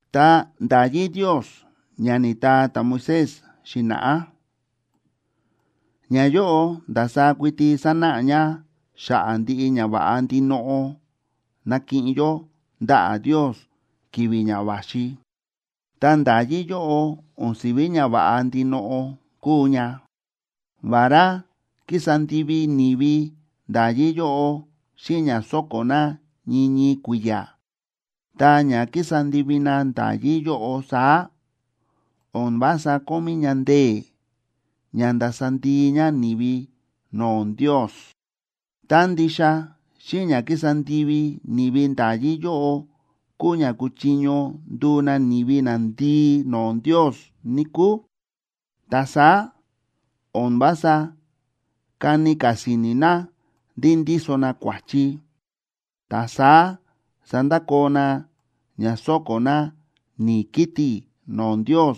Ta nda̱yí Ndios ña ni̱taa ta̱Moisés xi̱na̱ꞌá, ñayóꞌo ndasaá kuiti sánáꞌa ña xa̱ꞌa̱ ndiꞌi ñava̱ꞌa ndinoꞌo nakiꞌin yó ndaꞌa̱ Ndios ki̱vi̱ ña va̱xi. Ta nda̱yí yóꞌo o̱n si̱ví ñava̱ꞌa ndinoꞌo kúu ña. Vará kísa ndivi ni̱vi nda̱yí yóꞌo xíꞌin ña sóko̱ na ñii ñii kui̱ya̱, ta ña kísa ndivi na nda̱yí yóꞌo saá, o̱n vása kómí ña ndee̱ ña ndasa ndii ña ni̱vi no̱o̱ Ndios. Tá ndixa xíꞌin ña kísa ndivi ni̱vi nda̱yí yóꞌo kúu ña kuchiño nduu na ni̱vi nandii no̱o̱ Ndios, níkúu, ta saá o̱n vása kani ka̱ si̱ni̱ na ndí ndíso na kua̱chi, ta saá sandakoo na ña sóko̱ na ni̱i̱ kiti̱ no̱o̱ Ndios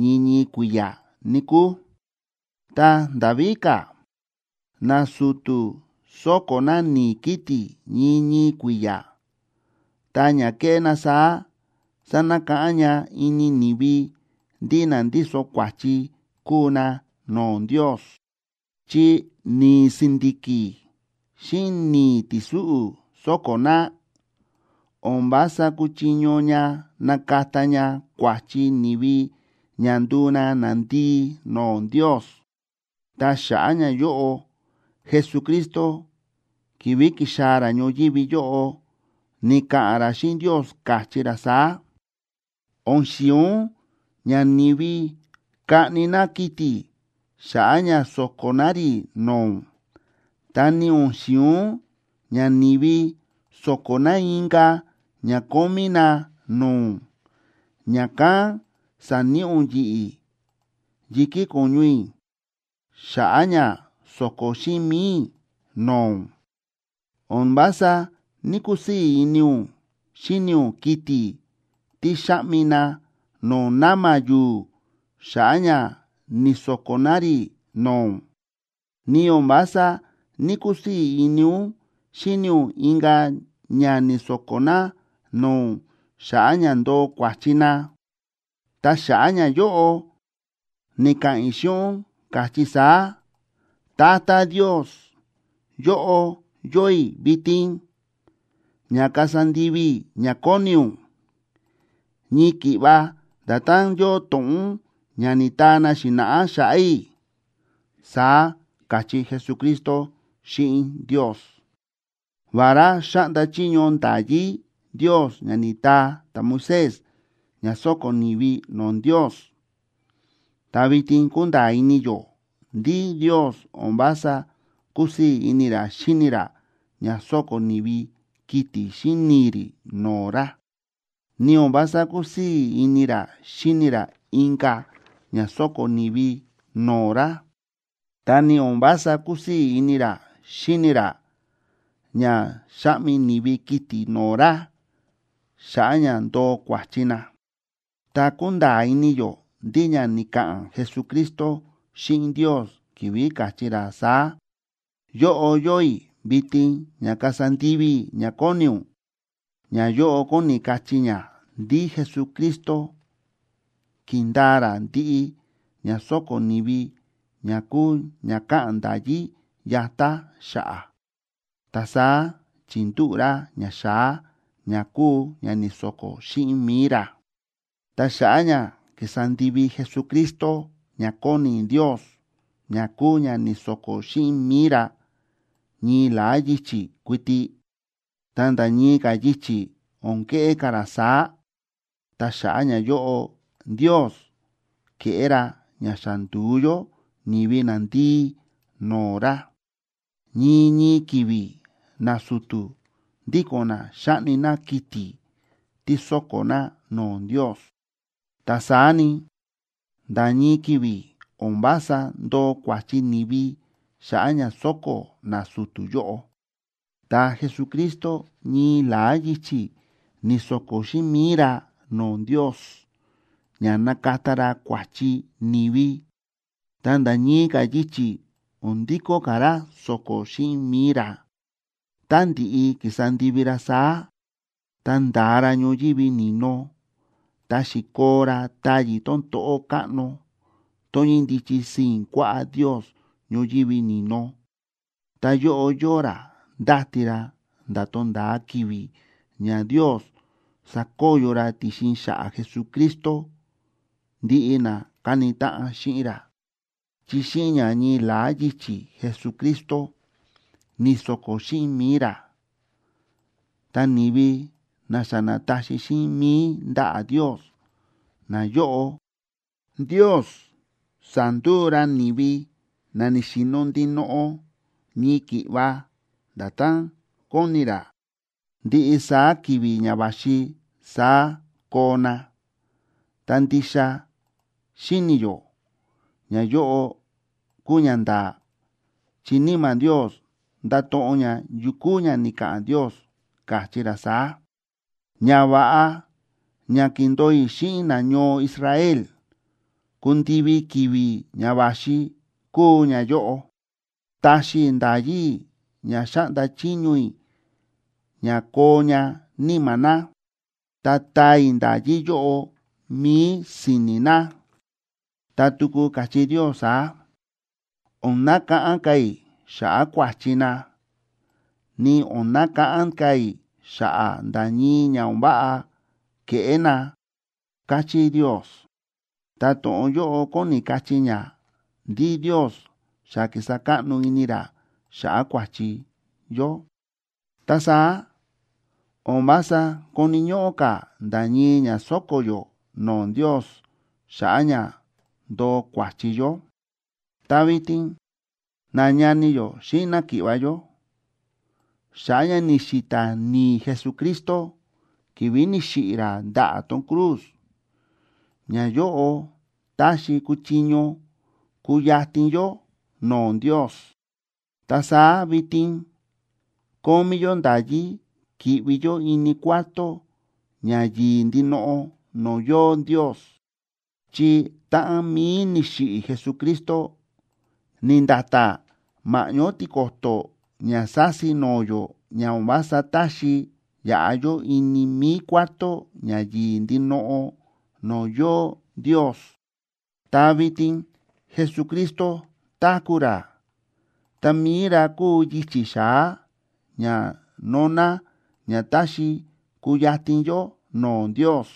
ñii ñii kui̱ya̱, níkúu. Ta nda̱ víka̱, nasu̱tu̱ sóko̱ na ni̱i̱ kiti̱ ñii ñii kui̱ya̱, ta ña kéꞌé na saá sánakáꞌán ña ini ni̱vi ndí na ndíso kua̱chi kúu na no̱o̱ Ndios. Chi ni̱i̱ si̱ndi̱ki̱ xíꞌin ni̱i̱ ti̱súꞌu̱ sóko̱ na, o̱n vása kúchiño ña nakata ña kua̱chi ni̱vi ña nduu na nandii no̱o̱ Ndios. Ta xa̱ꞌa̱ ñayóꞌo, Jesucristo ki̱vi̱ ki̱xaa̱ ra ñoyívi yóꞌo, ni̱ka̱ꞌa̱n ra xíꞌin Ndios, káchí ra saá: O̱n xi̱in ún ña ni̱vi kaꞌni na kiti̱ xa̱ꞌa̱ ña so̱ko̱ na rí no̱o̱ ún, ta ni o̱n xi̱in ún ña ni̱vi so̱ko̱ na inka̱ ña kómí na no̱o̱ ún. Ña̱kán sa̱níꞌi ún yi̱ꞌi̱ yi̱kí ko̱ñu i̱ xa̱ꞌa̱ ña so̱ko̱ xíꞌin mi̱i i̱ no̱o̱ ún. O̱n vása ní‑kusii̱ ini ún xíni ún kiti̱ tí xa̱ꞌmi na no̱o̱ na̱ma̱ yu̱u̱ xa̱ꞌa̱ ña ni̱so̱ko̱ na rí no̱o̱ ún. Ni o̱n vása ní‑kusii̱ ini ún xíni ún inka̱ ña ni̱so̱ko̱ na no̱o̱ ún xa̱ꞌa̱ ña ndoo kua̱chi na. Ta xa̱ꞌa̱ ñayóꞌo ni̱ka̱ꞌa̱n i̱ xíꞌin ún, káchí i̱ saá: “Tata Ndios, yóꞌo yóo i̱ vitin, ña kasa ndivi i̱ ña kóni ún, ñii ki̱ꞌva nda̱tán yóo to̱ꞌon ún ña ni̱taa na xi̱na̱ꞌá xa̱ꞌa̱ i̱”, saá káchí Jesucristo xíꞌin Ndios. Vará xáꞌnda chiño nda̱yí Ndios ña ni̱taa ta̱Moisés ña so̱ko̱ ni̱vi no̱o̱ Ndios, ta vitin kúnda̱a̱ ini yó ndí Ndios o̱n vása kúsii̱ ini ra xíni ra ña sóko̱ ni̱vi kiti̱ xíꞌin ni̱i̱ rí no̱o̱ ra, ni o̱n vása kúsii̱ ini ra xíni ra inka̱ ña sóko̱ ni̱vi no̱o̱ ra, ta ni o̱n vása kúsii̱ ini ra xíni ra ña xáꞌmi ni̱vi kiti̱ no̱o̱ ra xa̱ꞌa̱ ña ndoo kua̱chi na. Ta kúnda̱a̱ ini yó ndí ña ni̱ka̱ꞌa̱n Jesucristo xíꞌin Ndios ki̱vi̱ káchí ra saá: “Yóꞌo yóo i̱ vitin ña kasa ndivi i̱ ña kóni ún”, ñayóꞌo kóni kachí ña ndí Jesucristo ki̱ndaa ra ndiꞌi ña sóko̱ ni̱vi ña kúu ña káꞌa̱n nda̱yí yatá xa̱ꞌa̱, ta saá chi̱ndúꞌu̱ ra ñaxa̱á ña kúu ña ni̱so̱ko̱ xíꞌin mi̱i ra. Ta xa̱ꞌa̱ ña ki̱sa ndivi Jesucristo ña kóni Ndios ña kúu ña ni̱so̱ko̱ xíꞌin mi̱i ra ñii la̱á yichi̱ kuiti, ta nda̱ ñii ka̱ yichi̱ o̱n keꞌé ka̱ ra saá, ta xa̱ꞌa̱ ñayóꞌo Ndios ke̱ꞌé ra ña xa ndu̱u yó ni̱vi nandii no̱o̱ ra. Ñii ñii ki̱vi̱ nasu̱tu̱ ndíko̱n na xáꞌni na kiti̱ tí so̱ko̱ na no̱o̱ Ndios; ta saá ni, nda̱ ñii ki̱vi̱ o̱n vása ndoo kua̱chi ni̱vi xa̱ꞌa̱ ña sóko̱ nasu̱tu̱ yóꞌo. Ta Jesucristo ñii la̱á yichi̱ ni̱so̱ko̱ xíꞌin mi̱i ra no̱o̱ Ndios ña nakata ra kua̱chi ni̱vi, ta nda̱ ñii ka̱ yichi̱ o̱n ndikó ka̱ ra so̱ko̱ xíꞌin mi̱i ra. Tá ndi̱ꞌi ki̱sa ndivi ra saá, ta nda̱a ra ñoyívi ni̱no, ta xi̱koo ra táyi̱ tón to̱ꞌó káꞌno tón ñíndichi sii̱n kuaꞌá Ndios ñoyívi ni̱no. Ta yóꞌo yóo ra ndáti ra nda̱ tonda̱a ki̱vi̱ ña Ndios sakoyo ra ti̱xin xa̱ꞌa̱ Jesucristo ndiꞌi na káni táꞌan xíꞌin ra. Chi xíꞌin ña ñii la̱á yichi̱ Jesucristo ni̱so̱ko̱ xíꞌin mi̱i ra, ta ni̱vi na xa na̱taxi xíꞌin mi̱i ndaꞌa̱ Ndios, nayóꞌo, Ndios sa̱nduu ra na ni̱vi na ni̱xi̱no̱ ndinoꞌo ñii ki̱ꞌva nda̱tán kóni ra. Ndiꞌi saá ki̱vi̱ ña va̱xi saá koo na. Ta ndixa xíni̱ yó ñayóꞌo kúu ñanda̱a̱, chi Níma̱ Ndios nda̱to̱ꞌon ña yu kúu ña ni̱ka̱ꞌa̱n Ndios, káchí ra saá: Ñava̱ꞌa ña kindo̱o i̱ xíꞌin nañoo Israel kundivi ki̱vi̱ ña va̱xi, kúu ñayóꞌo: Taxi i̱ nda̱yí i̱ ña xáꞌnda chiño i̱ ña koo ña níma̱ na, ta taa i̱ nda̱yí yóꞌo mi̱i si̱ni̱ na. Ta tuku káchí Ndios saá: O̱n nakáꞌán ka̱ i̱ xa̱ꞌa̱ kua̱chi na, ni o̱n nakáꞌán ka̱ i̱ xa̱ꞌa̱ nda̱ ñii ña o̱n váꞌa ke̱ꞌé na, káchí Ndios. Ta to̱ꞌon yóꞌo kóni kachí ña ndí Ndios xa ki̱sa káꞌno ini ra xa̱ꞌa̱ kua̱chi yó. Ta saá o̱n vása koni̱ ñóꞌó ka̱ nda̱ ñii ña so̱ko̱ yó no̱o̱ Ndios xa̱ꞌa̱ ña ndoo kua̱chi yó. Ta vitin nañani yó xíꞌin náki̱ꞌva̱ yó, xa̱ꞌa̱ ña ni̱xi̱ta̱ ni̱i̱ Jesucristo ki̱vi̱ ni̱xiꞌi̱ ra ndaꞌa̱ tón cruz, ñayóꞌo táxi kuchiño kuyatin yó no̱o̱ Ndios, ta saá vitin kómí yó nda̱yí ki̱ꞌvi yó ini Cuarto Ña Yi̱i̱ Ndinoꞌo no̱o̱ yóo Ndios. Chi táꞌan mi̱i ni̱xiꞌi̱ Jesucristo, ni̱nda̱ta̱ ma̱ꞌñó tiko̱to̱ ña sa̱si no̱o̱ yó ña o̱n vása táxi yaꞌa yó ini mi̱i Cuarto Ña Yi̱i̱ Ndinoꞌo no̱o̱ yóo Ndios. Ta vitin Jesucristo táku̱ ra, ta mi̱i ra kúu yichi̱ xa̱á ña nóná ña táxi kuyatin yó no̱o̱ Ndios.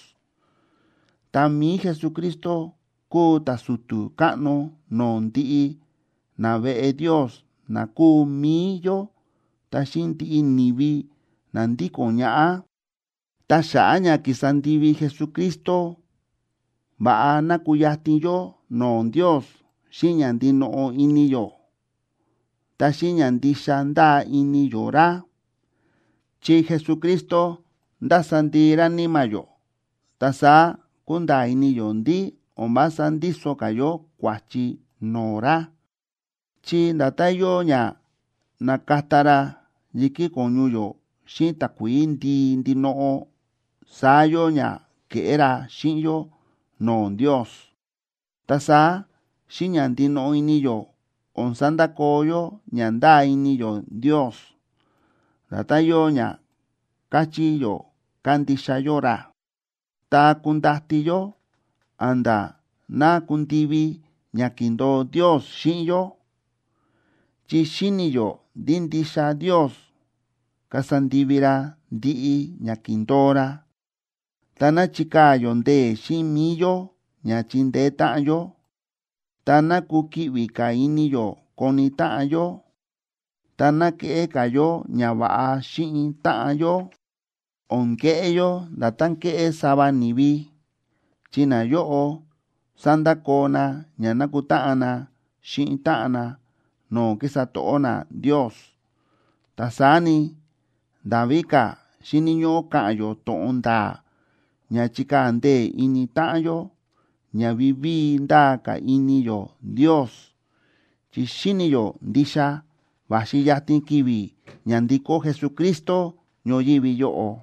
Ta mi̱i Jesucristo kúu ta̱su̱tu̱ káꞌno no̱o̱ ndiꞌi naveꞌe Ndios na kúu mi̱i yó ta xíꞌin ndiꞌi ni̱vi na ndíko̱n ñaꞌá. Ta xa̱ꞌa̱ ña ki̱sa ndivi Jesucristo, va̱ꞌa ná kuyatin yó no̱o̱ Ndios xíꞌin ña ndinoꞌo ini yó, ta xíꞌin ña ndixa ndáa ini yó ra. Chi Jesucristo nda̱sa ndii ra níma̱ yó, ta saá kúnda̱a̱ ini yó ndí o̱n vása ndíso ka̱ yó kua̱chi no̱o̱ ra, chi nda̱tán yóo ña na̱kata ra yi̱kí ko̱ñu yó xíꞌin takuií ndii ndinoꞌo, saá yóo ña ke̱ꞌé ra xíꞌin yó no̱o̱ Ndios. Ta saá xíꞌin ña ndinoꞌo ini yó o̱n sandakoo yó ña ndáa ini yó Ndios, nda̱tán yóo ña káchí yó kándixa yó ra, ta kundati yó a̱nda̱ ná kundivi ña ki̱ndo̱o Ndios xíꞌin yó. Chi xíni̱ yó ndí ndixa Ndios kasa ndivi ra ndiꞌi ña ki̱ndo̱o ra. Ta ná chikaa̱ yó ndee̱ xíꞌin mi̱i yó ña chindeé táꞌan yó, ta ná kukiꞌvi ka̱ ini yó koni táꞌan yó, ta ná keꞌé ka̱ yó ñava̱ꞌa xíꞌin táꞌan yó. O̱n keꞌé yó nda̱tán kéꞌé sava ni̱vi, chi nayóꞌo sándakoo na ña nákutáꞌan na xíꞌin táꞌan na no̱o̱ kísa to̱ꞌó na Ndios. Ta saá ni, nda̱ víka̱ xíni̱ ñóꞌó ka̱ꞌa̱n yó to̱ꞌon nda̱a̱ ña chikaa̱ ndee̱ ini táꞌan yó ña vivíi ndaa ka̱ ini yó Ndios, chi xíni̱ yó ndixa va̱xi yatin ki̱vi̱ ña ndikó Jesucristo ñoyívi yóꞌo.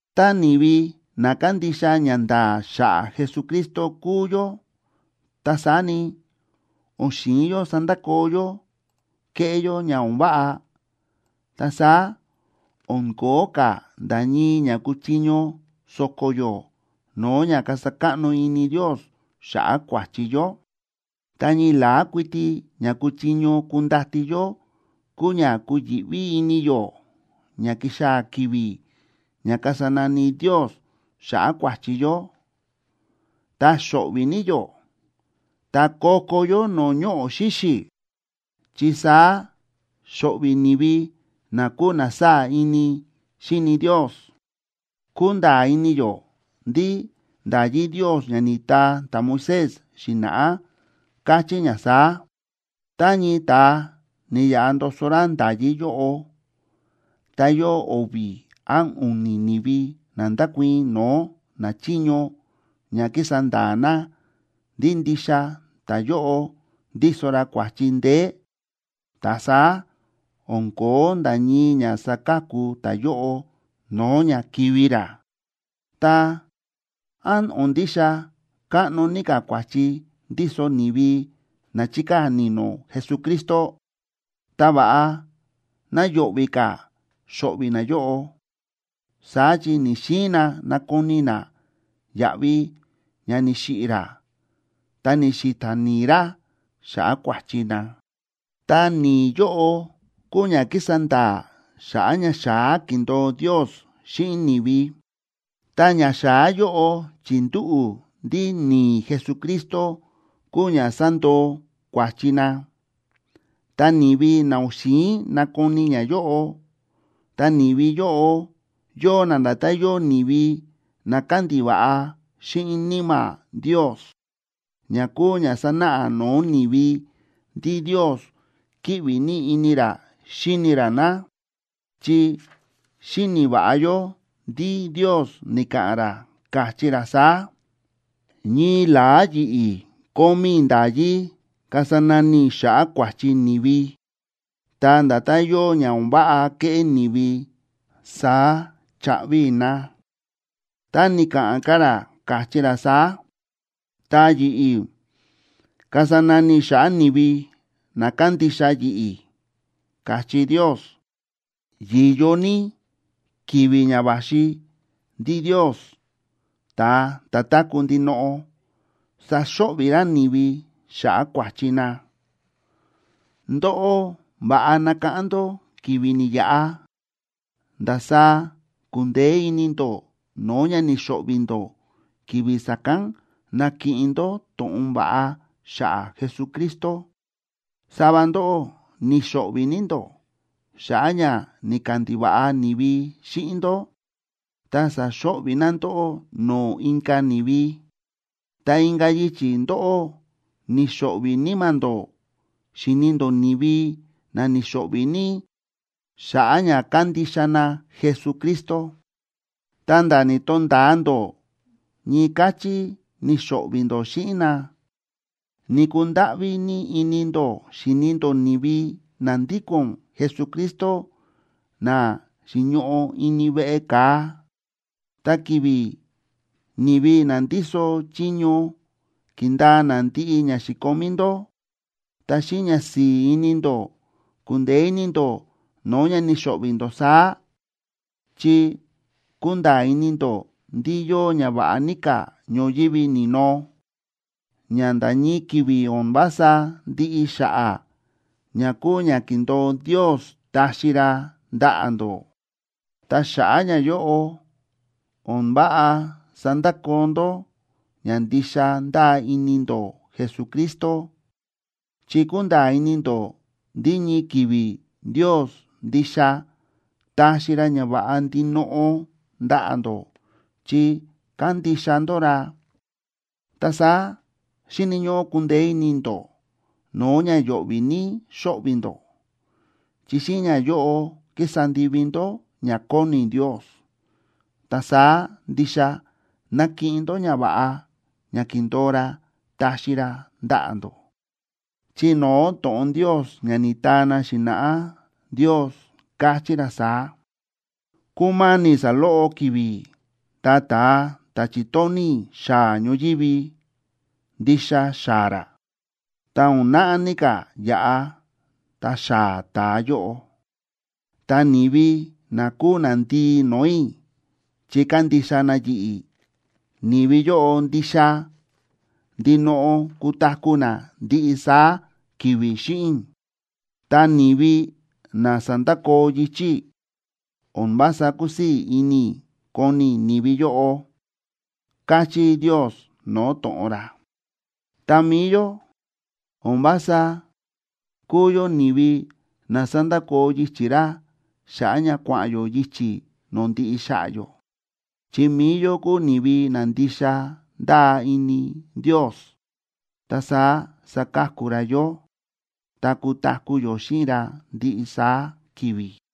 Tá ni̱vi na kándixa ñanda̱a̱ xa̱ꞌa̱ Jesucristo kúu yó, ta saá ni, o̱n xi̱in yó sandakoo yó kéꞌé yó ña o̱n váꞌa, ta saá o̱n ko̱ó ka̱ nda̱ ñii ña kuchiño so̱ko̱ yó no̱o̱ ña kasa káꞌno ini Ndios xa̱ꞌa̱ kua̱chi yó. Ta ñii la̱á kuiti ña kuchiño kundati yó kúu ña kuyi̱ꞌví ini yó ña kixaa̱ ki̱vi̱ ña kasa nani Ndios xa̱ꞌa̱ kua̱chi yó, ta xo̱ꞌvi̱ ní yó, ta ko̱ko̱ yó no̱o̱ ñoꞌo̱ xíxi̱, chi saá xo̱ꞌvi̱ ni̱vi na kúu na sáa̱ ini xíni Ndios. Kúnda̱a̱ ini yó ndí nda̱yí Ndios ña ni̱taa ta̱Moisés xi̱na̱ꞌá káchí ña saá: “Tá ñii ta̱a ni̱yaꞌa ndoso ra nda̱yí yóꞌo, ta yóo o̱vi̱ án u̱ni̱ ni̱vi na ndákuii̱n no̱o̱ nachiño ña kísa nda̱a̱ na ndí ndixa ta̱yóꞌo ndíso ra kua̱chi ndeé, ta saá o̱n ko̱ó nda̱ ñii ña saka̱ku ta̱yóꞌo no̱o̱ ña kivi̱ ra.” Ta, ¿án o̱n ndixa káꞌno ní ka̱ kua̱chi ndíso ni̱vi na chi̱kaa̱ ni̱no̱ Jesucristo?, ta va̱ꞌa ná yo̱ꞌvi̱ ka̱ xo̱ꞌvi̱ nayóꞌo, saá chi ni̱‑xiin na nakoni na yaꞌvi ña ni̱xiꞌi̱ ra ta ni̱xi̱ta̱ ni̱i̱ ra xa̱ꞌa̱ kua̱chi na. Ta ni̱i̱ yóꞌo kúu ña kísa nda̱a̱ xa̱ꞌa̱ ñaxa̱á ki̱ndo̱o Ndios xíꞌin ni̱vi, ta ñaxa̱á yóꞌo chi̱ndúꞌu̱ ndí ni̱i̱ Jesucristo kúu ña sandoo kua̱chi na. Ta ni̱vi na o̱n xi̱in nakoni ñayóꞌo, ta ni̱vi yóꞌo yóo na nda̱tán yóo ni̱vi na kándiva̱ꞌa xíꞌin Níma̱ Ndios, ña kúu ña sánáꞌa no̱o̱ ni̱vi ndí Ndios kíꞌvi ní ini ra xíni ra na. Chi xíni̱ va̱ꞌa yó ndí Ndios ni̱ka̱ꞌa̱n ra, káchí ra saá: “Ñii la̱á yi̱ꞌi̱ kómí i̱ nda̱yí kasa nani i̱ xa̱ꞌa̱ kua̱chi ni̱vi, ta nda̱tán yóo ña o̱n váꞌa ke̱ꞌé ni̱vi, saá chaꞌvi i̱ na.” Ta ni̱ka̱ꞌa̱n ka̱ ra, káchí ra saá: “Ta yi̱ꞌi̱ kasa nani i̱ xa̱ꞌa̱ ni̱vi na kándixa yi̱ꞌi̱”, káchí Ndios. ¡Yi̱yo ní ki̱vi̱ ña va̱xi ndí Ndios, ta̱a ta̱ táku̱ ndinoꞌo, saxo̱ꞌvi̱ ra ni̱vi xa̱ꞌa̱ kua̱chi na! Ndóꞌó, va̱ꞌa nakáꞌán ndó ki̱vi̱ ni̱yaꞌa, ndasaá ku̱ndeé ini ndó no̱o̱ ña ni̱xo̱ꞌvi̱ ndó ki̱vi̱ sa̱kán na̱kiꞌin ndó to̱ꞌon va̱ꞌa xa̱ꞌa̱ Jesucristo. Sava ndóꞌó ni̱xo̱ꞌvi̱ ní ndó xa̱ꞌa̱ ña ni̱kandiva̱ꞌa ni̱vi xíꞌin ndó ta sa̱xo̱ꞌvi̱ na ndóꞌó no̱o̱ inka̱ ni̱vi. Ta inka̱ yichi̱ ndóꞌó ni̱xo̱ꞌvi̱ níma̱ ndó xíni ndó ni̱vi na ni̱xo̱ꞌvi̱ ní xa̱ꞌa̱ ña kándixa na Jesucristo, ta̱nda̱ ni̱to̱nda̱a ndó ñii káchí ni̱xo̱ꞌvi̱ ndó xíꞌin na. Ni̱kundáꞌví ní ini ndó xi̱ni ndó ni̱vi na ndíko̱n Jesucristo na xi̱ñoꞌo ini veꞌe ka̱a. Ta ki̱vi̱ ni̱vi na ndíso chiño ki̱ndaa na ndiꞌi ña xi̱komí ndó, ta xíꞌin ñasi̱i̱ ini ndó ku̱ndeé ini ndó no̱o̱ ña ni̱xo̱ꞌvi̱ ndó saá, chi kúnda̱a̱ ini ndó ndí yóo ñava̱ꞌa ní ka̱ ñoyívi ni̱no, ña nda̱ ñii ki̱vi̱ o̱n vása ndiꞌi xa̱ꞌa̱ ña kúu ña ki̱ndo̱o Ndios taxi ra ndaꞌa̱ ndó. Ta xa̱ꞌa̱ ñayóꞌo, o̱n váꞌa sandakoo ndó ña ndixa ndáa ini ndó Jesucristo, chi kúnda̱a̱ ini ndó ndí ñii ki̱vi̱ Ndios ndixa taxi ra ñava̱ꞌa ndinoꞌo ndaꞌa̱ ndó chi kándixa ndó ra. Ta saá xíni̱ ñóꞌó kundeé ini ndó no̱o̱ ña yo̱ꞌvi̱ ní xóꞌvi̱ ndó, chi xíꞌin ñayóꞌo kísa ndivi ndó ña kóni Ndios, ta saá ndixa nakiꞌin ndó ñava̱ꞌa ña ki̱ndo̱o ra taxi ra ndaꞌa̱ ndó. Chi no̱o̱ to̱ꞌon Ndios ña ni̱taa na xi̱na̱ꞌá, Ndios káchí ra saá: Kúma̱ni̱ saloꞌo ki̱vi̱ ta ta̱a ta̱ chi̱tóni̱ i̱ xaa̱ ñoyívi, ndixa xaa̱ ra, ta o̱n naꞌá ní ka̱ yaꞌa, ta xaa̱ ta̱a yóꞌo. Ta ni̱vi na kúu nandii no̱o̱ i̱ chi kándixa na yi̱ꞌi̱, ni̱vi yóꞌo ndixa ndinoꞌo kutaku̱ na ndiꞌi saá ki̱vi̱ xíꞌin i̱, ta ni̱vi na sandakoo yichi̱ i̱, o̱n vása kusii̱ ini i̱ koni i̱ ni̱vi yóꞌo, káchí Ndios no̱o̱ to̱ꞌon ra. Ta mi̱i yó, o̱n vása kúu yó ni̱vi na sándakoo yichi̱ ra xa̱ꞌa̱ ña kua̱ꞌa̱n yó yichi̱ no̱o̱ ndiꞌi xa̱ꞌa̱ yó. Chi mi̱i yó kúu ni̱vi na ndixa ndáa ini Ndios, ta saá saka̱ku ra yó, ta kutaku̱ yó xíꞌin ra ndiꞌi saá ki̱vi̱.